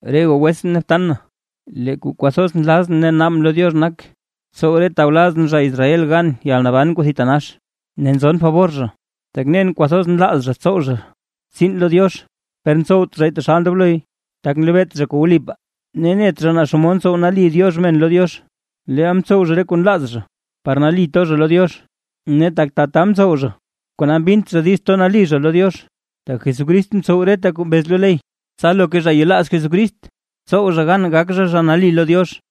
Re goo wetsʼn ne btan na, lee kuu kwathoz nlazʼn ne naabʼn lo Diox nak, tsow re tawlazʼn zha Israel gan yalnaban kuu thitanax. Ne nzon fabor zha, tak nen kwathoz nlaaz zha tsow zha tsiin lo Diox, per ntsowt zhay taxal ndobloy, tak nlebeet zha kuu wlipaa. Ne net zha naa xomod ntsow nali Diox men lo Diox; leel mtsow zha re kuu nlaaz zha par nali to zha lo Diox, ne tak tata mtsow zha kona mbint zha diiz nali gato zha lo Diox, tak Jesucrist mtsow reta kuu mbez lo ley, tsa loka zha kuu yelaaz Jesucrist tsow zha gan gak zha, zha nali lo Diox.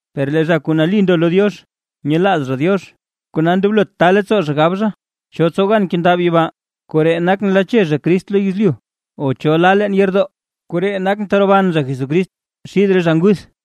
Per lee zha kuu nali ndo lo Diox, nyelaaz zha Diox. Kona ndoblot ta leettsoo zha gab zha: “¿Cho tsow gan kendab yibaa? Koree nak nlache zha Crist lo yezlyu; o ¿cho la leen yeerdoo? Koree nak teroban zha Jesucrist xid re zha nguth.”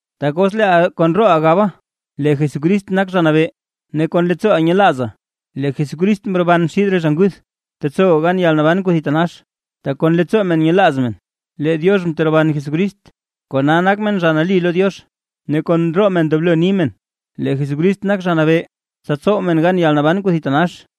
Tak os leeʼa kon rooʼa gaba lee Jesucrist nak Zha Nabee, ne kon leettsooʼa nyelaaza lee Jesús mroban xid re zha nguth, tetsowa gan yalnaban kuu thitanax. Tak kon leettsoo men nyelaaz men lee Diox mteroban Jesucrist, kona nak men zha nali lo Diox, ne kon roo men ndoblo ni men lee Jesucrist nak Zha Nabee, tsa tsow men gan yalnaban kuu thitanax.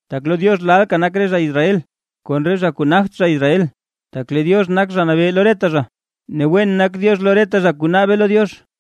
Tak lo Diox lalka nak re zha Israel kon re zha kuu nagt zha Israel. Tak lee Diox nak Zha Nabee lo reta zha, ne wen nak Diox lo reta zha kuu naabe lo Diox.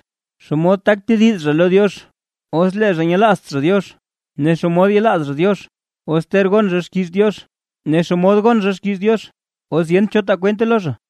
Ne ¿xomod tak tediz zha lo Diox, os lee zha nyelaazt zha Diox? ¿Ne xomod yelaaz zha Diox os ter gon zha xkiiz Diox? ¿Ne xomod gon zha xkiiz Diox, os yent cho taa kwente lo zha?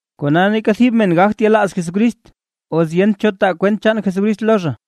Kona neeka thib men gagt yelaaz Jesucrist, os yent cho taa kwent chaan Jesucrist lo zha.